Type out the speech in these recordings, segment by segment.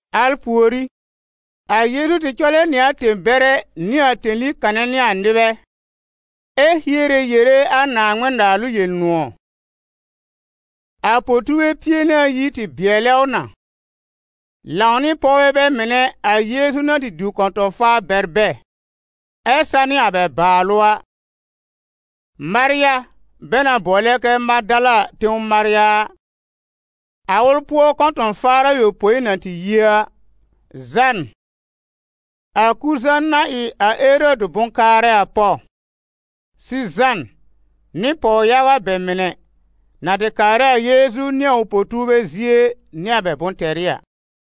Al pùorí, a Yeezu tɩ cɔlɛ nɩ a tẽ-bɛrɛ nɩ a tẽli kanɛ nɩ a nɩbɛ, ɛ hiere yere a Naaŋmɩn-Naalʋ Yel-nʋ̃ɔ̀. A po-tuurbɛ pie nɩ ayi tɩ bɩɛlɛ ʋ na, lãw nɩ pɔwbɛ bɛ mɩnɛ a Yeezu na tɩ diw kɔ̃tɔ̃-faar bɛr bɛ ɛ sanɩ a bɛ bàalʋ a: Marya bɛ na bʋɔlɛ kɛ Madala tẽw Marya a, a ʋl pʋɔ kɔ̃tɔ̃-faar ayopõi na tɩ yi a, Zãn, a Kuza na ɩ a Erɔdɩ bʋ̃-kaarɛ a pɔw, Sizãn nɩ pɔw-yaga bɛ mɩnɛ, na tɩ kaarɛ a Yeezu nɩ a ʋ po-tuurbɛ zie nɩ a bɛ bʋ̃-tɛrɩ a.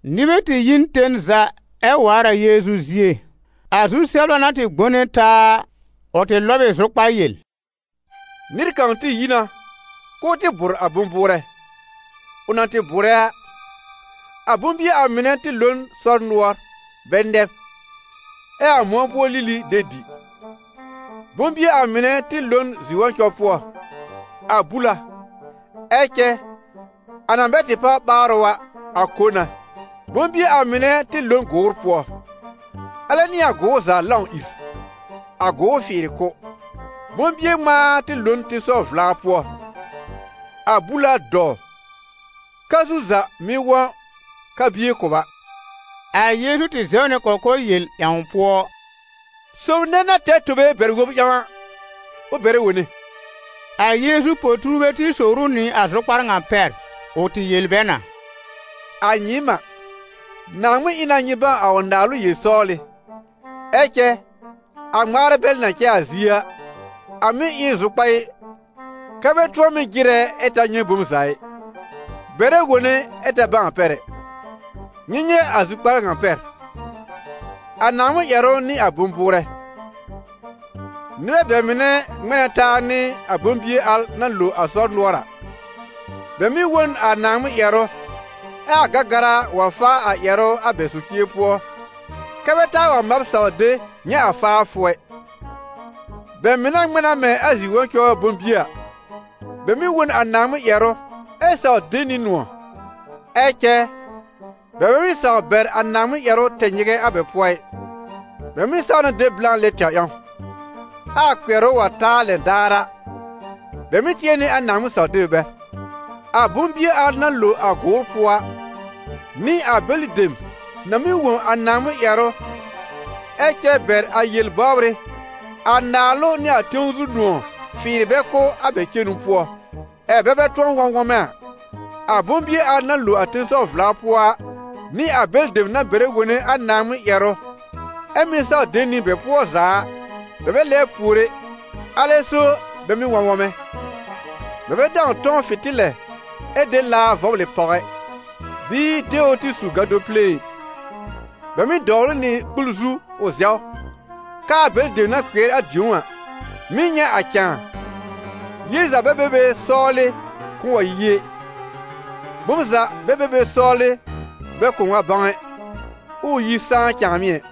Nɩbɛ tɩ yi n ten za ɛ waar a Yeezu zie. A zu-sɛbla na tɩ gbone taa a, ʋ tɩ lɔb ɩ zʋkpar yel: «Nɩr kãw tɩ yi na k'ʋʋ tɩ bʋ̀r a bʋ̃-bʋʋrɛ. Ʋ na tɩ bʋ̀rɛ a, a bʋ̃-bie a mɩnɛ tɩ lo n sɔr-nʋɔr bɛ nɛb, ɛ a mʋ̃ɔ pʋɔ lili de dɩ. Bʋ̃-bie a mɩnɛ tɩ lo n zi-wɔ̃cɔ pʋɔ: a bul a, ɛ cɛ a na bɛ tɩ páwr ɓaarʋ a, a ko na. Bʋ̃-bie a mɩnɛ mɩ̀ tɩ lo n gʋʋr pʋɔ, alɛ nɩ a gʋʋr za lãw ìr, a gʋʋr fɩɩrɩ kʋ́. Bʋ̃-bie ŋmãa tɩ lo n tẽsɔw-vla pʋɔ; a bul a dɔw, ka-zu za mɩ́ wɔ̃ ka-bie kʋba.» A Yeezu tɩ zɛw nɩ kɔkɔr yel ƴãw pʋɔ: «Sob nɛ na tɛr tobe bɛr-wob ƴãw a, ʋ bɛrɛ wone.» A Yeezu po-tuurbɛ tɩ sowr ʋ nɩ a zʋkpar ŋa pɛr. Ʋ tɩ yel bɛ na: «A nyɩɩm a, Naaŋmɩn ɩ na nyɩ bãw a ʋ naalʋ yel-sɔwlɩ; ɛ cɛ a ŋmaarɛ bɛl na cɛ a zie a, a mɩ́ ɩ n zʋkpaɩ, kɛ́ ‹bɛ tʋ̃ɔ mɩ́ jɩrɛ ɛ ta nyɛ̃ bom za ɩ, bɛrɛ wone ɛ ta bãw a pɛr ɛ.›» «Nyɩ nyɛ̃ a zʋkpar ŋa pɛr: a Naaŋmɩn ƴɛrʋ n'ɩ a bʋ̃-bʋʋrɛ. Nɩbɛ bɛ mɩnɛ ŋmɛ̃ na taa nɩ a bʋ̃-bie al na lo a sɔr nʋɔr a: bɛ mɩ́ wõ n a Naaŋmɩn ƴɛrʋ, ɛ a Gɛgɛra wa faa a ƴɛrʋ a bɛ socie pʋɔ kɛ́ bɛ taa wa mab saw de, nyɛ̃ a faafʋ ɛ. Bɛ mɩnɛ ŋmɛ̃ na mɛ̃ a zi-wɔ̃cɔ bʋ̃-bie a: bɛ mɩ́ wõ n a Naaŋmɩn ƴɛrʋ ɛ saw de nɩ nʋ̃ɔ̀. Ɛ cɛ bɛ bɛ mɩ́ saw bɛr a Naaŋmɩn ƴɛrʋ tɛ nyɩgɛ a bɛ pʋɔ ɩ, bɛ mɩ́ saw na de blã lɛ tɛwr ƴãw. Ɛ a kpɩɛrʋ wa ta a lɛn daar a, bɛ mɩ́ tɩɛ nɩ a Naaŋmɩn saw-deb bɛr. A bʋ̃-bie al na lo a gʋʋr pʋɔ a, n'ɩ a bɛlɩ dem na mɩ́ wõ a Naaŋmɩn ƴɛrʋ ɛ cɛ bɛr a yel-bɔbrɩ, a naalʋ nɩ a tẽw zu nʋ̃ɔ̀ fɩɩrɩ bɛ kʋ́ a bɛ cenu pʋɔ, ɛ bɛ bɛ tʋ̃ɔ wɔ̃ wɔmɛ a. A bʋ̃-bie al na lo a tẽsɔw-vla pʋɔ a n'ɩ a bɛlɩ dem na bɛrɛ wone a Naaŋmɩn ƴɛrʋ, ɛ mɩ́ saw de nɩ bɛ pʋɔ za a. Bɛ bɛ lɛbr pùor ɛ, alɛ so bɛ mɩ́ wɔ̃ wɔmɛ.» «Bɛ bɛ dãw tɔ̃w fɩ̃tɩlɛ ɛ de laa vɔblɩ pàw ɛ, bɩɩ de ʋ tɩ su gado pile ɩ; bɛ mɩ́ dɔwl ʋ nɩ kpul zu ʋ zɛw, k'aa bɛlɩ dem na kpɩɛr a dĩ̀ó a, mɩ́ nyɛ̃ a cãa. Yel za bɛ be be sɔwlɩ kʋ̃ʋ wa yi ɛ, bom za bɛ be be sɔwlɩ bɛ kʋ̃ʋ wa bãw ɛ, ʋʋ yi sãá cãamɩ ɛ.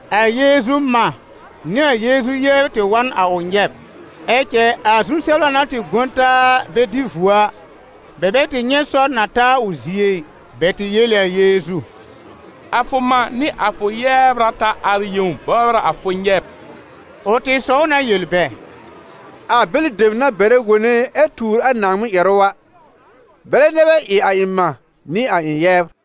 A Yeezu mã nɩ a Yeezu yɛbr tɩ wa n a ʋ nyɛb. Ɛ cɛ a zu-sɛbla na tɩ gbõ taa bɛ dɩ vuo a, bɛ bɛ tɩ nyɛ̃ sɔr na ta a ʋ zie ɩ. Bɛ tɩ yel ɩ a Yeezu: «A fʋ mã nɩ a fʋ yɛbr a ta ar yẽw bɔbr a fʋ nyɛb.» Ʋ tɩ sɔw na yel bɛ: «A bɛlɩ dem na bɛrɛ wone ɛ tuur a Naaŋmɩn ƴɛrʋ a, bɛlɛ nɛ bɛ ɩ a ɩ̃ mã nɩ a ɩ̃ yɛbr.»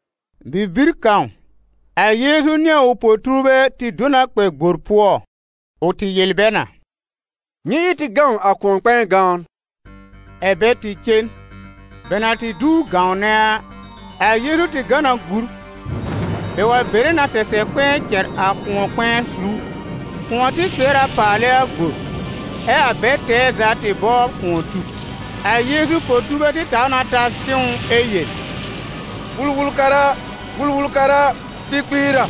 Bibir kãw, a Yeezu nɩ a ʋ po-tuurbɛ tɩ do na kpɛ gbor pʋɔ; ʋ tɩ yel bɛ na: «Nyɩ ɩ tɩ gãw a kʋ̃ɔ-kpɛ̃ɛ gãwn.» Ɛ̀ bɛ tɩ cen. Bɛ na tɩ duwr gãwnɛ a, a Yeezu tɩ gã na gúr. Bɛ wa bere na sɛsɛb kpɛ̃ɛ cɛr a kʋ̃ɔ-kpɛ̃ɛ zu. Kʋ̃ɔ tɩ kpɩɛr a paalɛ a gbor, ɛ a bɛl tɛɛ za tɩ bɔbr kʋ̃ɔ tub. A Yeezu po-tuurbɛ tɩ taw na ta sɩ̃w ʋ ɛ yel: «Wul-wul-kara a, Wul-wul-kara a, tɩ kpiir a!»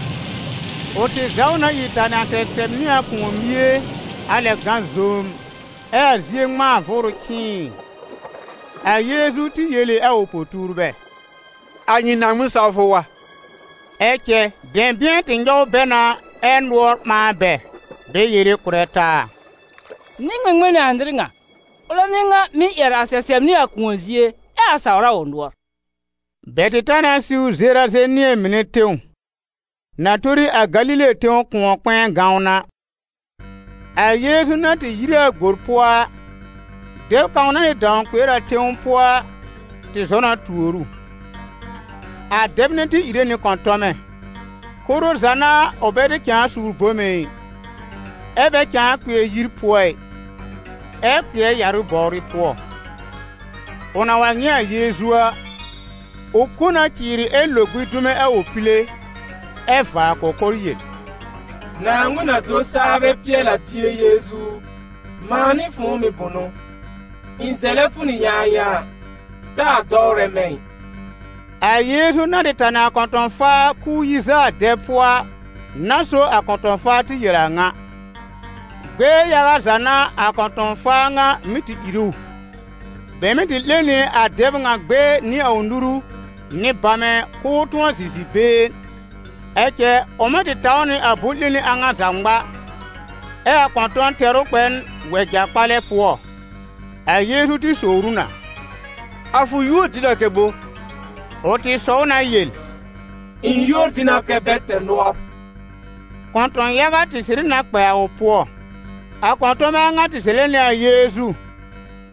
Ʋ tɩ zaw na ìr tanɩ a sɛsɛb nɩ a kʋ̃ɔ-mie a lɛb gã zoom, ɛ a zie ŋmãa vʋʋrʋ cɩ̃ɩɩ. A Yeezu tɩ yel ɩ a ʋ po-tuurbɛ: «A nyɩ Naaŋmɩn-sawfʋ wa?» Ɛ cɛ dɛ̃bɩ̃ɛ tɩ nyɔw bɛ na ɛ nʋɔr ɓãa bɛ, bɛ yere kʋ̀rɛ taa: «Nɩ-ŋmɩŋmɩn n'ɩ a nɩr ŋa? Ʋlɛ n'ɩ ŋan mɩ́ ƴɛr a sɛsɛb nɩ a kʋ̃ɔ zie, ɛ a saw a ʋ nʋɔr.» Bɛ tɩ ta na siw Zerazenɩ̃ɛ mɩnɛ tẽw, na tori a Galile tẽw kʋ̃ɔ-kpɛ̃ɛ gãwn a. A Yeezu na tɩ yire a gbor pʋɔ a, dɛb kãw na tɩ dãw kpɩɛr a tẽw pʋɔ a, tɩ zɔ na tuor ʋ. A dɛb nɛ tɩ ìre nɩ kɔ̃tɔmɛ. Koro za n'a ʋ bɛ tɩ cãa suur bome ɩ, ɛ bɛ cãa kpɩɛr yir pʋɔ ɩ, ɛ kpɩɛr yarʋ bɔwrɩ pʋɔ. Ʋ na wa nyɛ̃ a Yeezu a, ʋ kõ na cɩɩrɩ ɛ lo gbĩ dume a ʋ pile, ɛ vaa kɔkɔr yel: «Naaŋmɩn-na-do-saa-bɛ-pɩɛl-a Bie Yeezu u, mãa nɩ fʋ̃ʋ mɩ̀ bʋnʋ? Ɩ̃ zɛlɛ fʋ nɩ yãayãa, taa dɔwrɛ mɛ̃ ɩ!» A Yeezu na tɩ tanɩ a kɔ̃tɔ̃-faa k'ʋʋ yi zaa a dɛb pʋɔ a, n'a so a kɔ̃tɔ̃-faa tɩ yel a a ŋa. Gbɛɛ yaga za n'a a kɔ̃tɔ̃-faa ŋa mɩ́ tɩ ìr ʋ. Bɛ mɩ́ tɩ 'lẽ nɩ a dɛb ŋa gbɛɛ nɩ a ʋ nuru nɩ bamɛ k'ʋʋ tʋ̃ɔ zɩ̃ zi-been, ɛ cɛ ʋ mɩ́ tɩ taw nɩ a bʋ̃-'lẽni a ŋa za ŋma, ɛ a kɔ̃tɔ̃n tɛr ʋ kpɛ n wɛja-kpalɛ pʋɔ. A Yeezu tɩ sowr ʋ na: «A fʋ yuór dɩ na kɛ bo?» Ʋ tɩ sɔw na yel: «Ɩ̃ yuór dɩ na kɛ ‹Bɛ-tɛr-nʋɔr.›» Kɔ̃tɔ̃-yaga tɩ sɩrɩ na kpɛ a ʋ pʋɔ. A kɔ̃tɔmɛ a ŋa tɩ zɛlɛ nɩ a Yeezu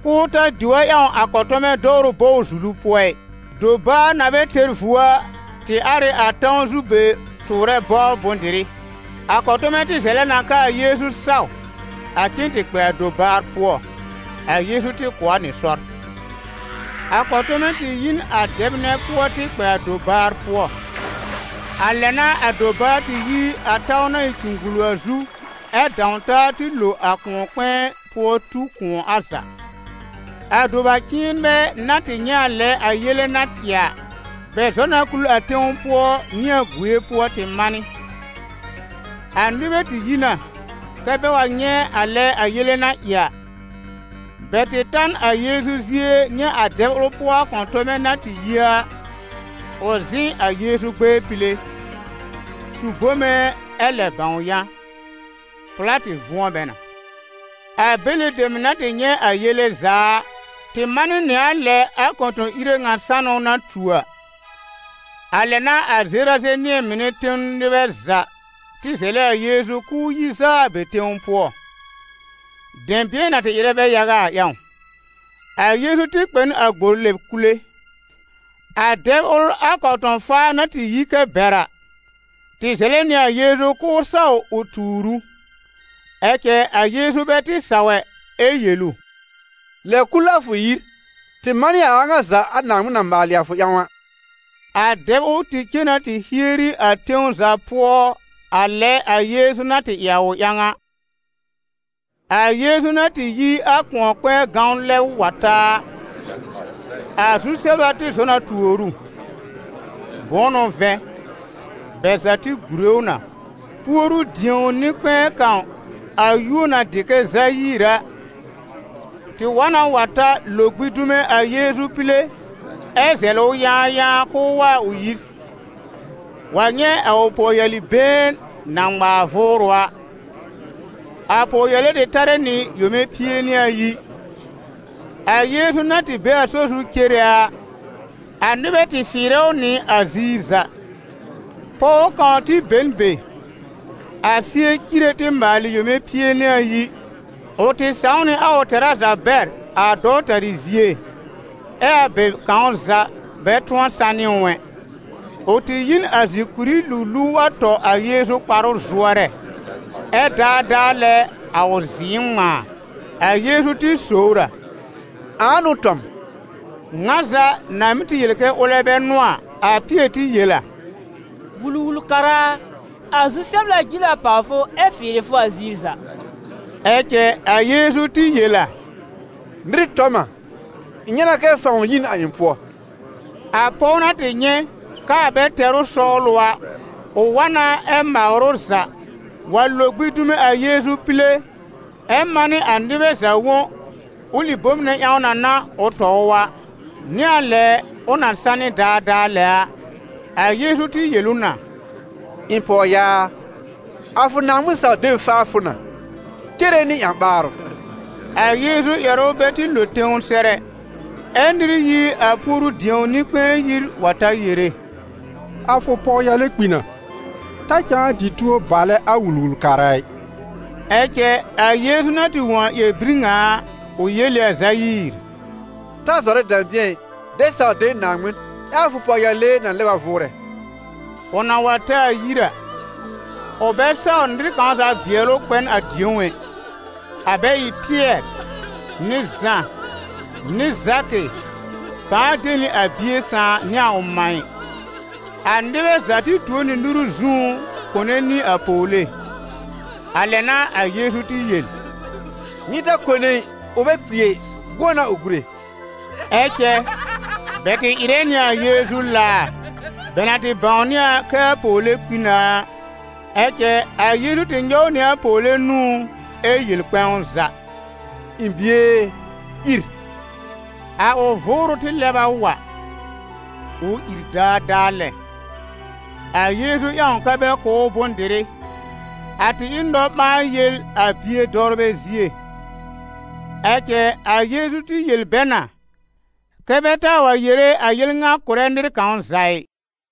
k'ʋʋ ta diw a ƴãw a kɔ̃tɔmɛ dɔwrʋ bɔw-zulu pʋɔ ɩ. Dobaar na bɛ tɛr vuo a, tɩ ar ɩ a tãw zu be tʋʋrɛ bɔbr bʋ̃-dɩrɩ. A kɔ̃tɔmɛ tɩ zɛlɛ na k'aa Yeezu saw a cen tɩ kpɛ a dobaar pʋɔ. A Yeezu tɩ kʋ̀ a nɩ sɔr. A kɔ̃tɔmɛ tɩ yi n a dɛb nɛ pʋɔ tɩ kpɛ a dobaar pʋɔ. A lɛ n'a a dobaar tɩ yi a tãw na ɩ cugbulu a zu ɛ dãw taa tɩ lo a kʋ̃ɔ-kpɛ̃ɛ pʋɔ tu kʋ̃ɔ a za. A doba-cɩ̃ɩnbɛ na tɩ nyɛ̃ a lɛ a yele na ɩ a, bɛ zɔ na kul a tẽw pʋɔ nɩ a gue pʋɔ tɩ manɩ. A nɩbɛ tɩ yi na kɛ bɛ wa nyɛ̃ a lɛ a yele na ɩ a. Bɛ tɩ ta n a Yeezu zie nyɛ̃ a dɛb ʋl pʋɔ a kɔ̃tɔmɛ na tɩ yi a, ʋ zɩ̃ a Yeezu gbɛɛ pile, su bome ɛ lɛb bãw yã. Pʋ̀lá tɩ vʋ̃ɔ bɛ na. A bɛlɩ dem na tɩ nyɛ̃ a yele za a, tɩ manɩ nɩ a lɛ a kɔ̃tɔ̃-ire ŋa sanʋ na tu a. A lɛ n'a a Zerazenɩ̃ɛ mɩnɛ tẽw nɩbɛ za tɩ zɛlɛ a Yeezu k'ʋʋ yi zaa a bɛ tẽw pʋɔ, dɛ̃bɩ̃ɛ na tɩ ɩrɛ bɛ yaga a ƴãw. A Yeezu tɩ kpɛ n a gbor lɛb kule. A dɛb ʋl a kɔ̃tɔ̃-faar na tɩ yi kɛ bɛr a, tɩ zɛlɛ nɩ a Yeezu k'ʋʋ saw ʋ tuur ʋ. Ɛ cɛ a Yeezu bɛ tɩ saw ɛ, ɛ yel ʋ: «Lɛb kul a fʋ yir, tɩ manɩ a a ŋa za a Naaŋmɩn na maalɩ a fʋ ƴãw a.» A dɛb ʋl tɩ cen na tɩ hieri a tẽw za pʋɔ a lɛ a Yeezu na tɩ ɩ a ʋ ƴãw a. A Yeezu na tɩ yi a kʋ̃ɔ-kpɛ̃ɛ gãwn lɛb wa ta a, a zu-sɛbla tɩ zɔ na tuor ʋ, bʋ̃ʋ n'ʋ vɛ̃, bɛ za tɩ gùre ʋ na. Puoru-dĩo nɩ-kpɛ̃ɛ kãw, a yúor na dɩ kɛ Zayiir a, tɩ wa na wa ta lo gbĩ dume a Yeezu pile ɛ zɛlɩ ʋ yãayãa k'ʋʋ wa a ʋ yir, wa nyɛ̃ a ʋ pɔwyali-been na ŋmaar vʋʋrʋ a. A pɔwyale tɩ tarɛ nɩ yome pie nɩ ayi. A Yeezu na tɩ be a sɔr zu cere a, a nɩbɛ tɩ fɩɩrɛ ʋ nɩ a ziir za. Pɔw kãw tɩ be n be, a sɩɛ cire tɩ maalɩ yome pie nɩ ayi. Ʋ tɩ sãw nɩ a ʋ tɛra za bɛr a dɔwtarɩ zie, ɛ a bɛ kãw za bɛ tʋ̃ɔ sanɩ ʋ ɛ. Ʋ tɩ yi n a zìkùrí luluw wa tɔ a Yeezu kparʋ zʋɔrɛ, ɛ daadaa lɛ a ʋ zɩ̃ɩ ŋmãa. A Yeezu tɩ sowr a: «Ãa n'ʋ tɔ m?» Ŋa za na mɩ́ tɩ yel kɛ ʋlɛ bɛ n'ʋ a, a Pɩɛr tɩ yel a: «Wul-wul-kara a, a zu-sɛbla jil a pàw fʋ ɛ fɩɩrɩ fʋ a ziir za!» Ɛ cɛ a Yeezu tɩ yel a: «Nɩr tɔ m a, ɩ̃ nyɛ̃ na kɛ fãw yi n a ɩ̃ pʋɔ.» A pɔw na tɩ nyɛ̃ k'aa bɛ tɛr ʋ sɔwlʋ a, ʋ wa na ɛ mawr ʋ za, wa lo gbĩ dume a Yeezu pile, ɛ manɩ a nɩbɛ za wõ ʋlɩ bom nɛ ƴãw na n'a ʋ tɔ ʋ a, nɩ a lɛ ʋ na sanɩ daadaa lɛ a. A Yeezu tɩ yel ʋ na: «Ɩ̃ pɔwyaa a, a fʋ Naaŋmɩn-saw-deb faa fʋ na, cere nɩ ƴã-ɓaarʋ.» A Yeezu ƴɛrʋ bɛ tɩ lo tẽw sɛr ɛ, ɛ nɩr yi a puoru-dĩo nɩ-kpɛ̃ɛ yir wa ta yere: «A fʋ pɔwyale kpi na, ta cãa dɩ tuo balɛ a Wul-wul-kara ɩ.» Ɛ cɛ a Yeezu na tɩ wõ a ƴɛr-bir ŋa a, ʋ yel ɩ a Zayiir: «Ta zɔrɛ dɛ̃bɩ̃ɛ ɩ, dɛ saw de Naaŋmɩn, ɛ a fʋ pɔwyale na lɛb a vʋʋrɛ.» Ʋ na wa ta a yir a, ʋ bɛ saw nɩr kãw za bɩɛl ʋ kpɛ n a dĩ̀ó ɛ, a bɛ ɩ Pɩɛr nɩ Zã nɩ Zakɩ, pãa de nɩ a bie sãà nɩ a ʋ mã ɩ. A nɩbɛ za tɩ tuo nɩ nuru zũú kone nɩ a pɔwle. A lɛ n'a a Yeezu tɩ yel: «Nyɩ ta kone ɩ, ʋ bɛ kpi ɛ, gʋ̃ɔ n'a ʋ gúre!» Ɛ cɛ bɛ tɩ ɩrɛ nɩ a Yeezu laar, bɛ na tɩ bãwnɩ a kɛ a pɔwle kpi na a. Ɛ cɛ a Yeezu tɩ nyɔw nɩ a pɔwle nũú ɛ yel kpɛ̃w za: «Ɩ̃ bie e, ìr!» A ʋ vʋʋrʋ tɩ lɛb a wa, ʋ ìr daadaa lɛ. A Yeezu ƴãw kɛ́ bɛ kʋ̀ ʋ bʋ̃-dɩrɩ. A tɩ ɩ n nɔ-ɓãa-yel a bie dɔwrbɛ zie. Ɛ cɛ a Yeezu tɩ yel bɛ na kɛ bɛ taa wa yere a yel ŋa kʋ̀rɛ nɩr kãw za ɩ.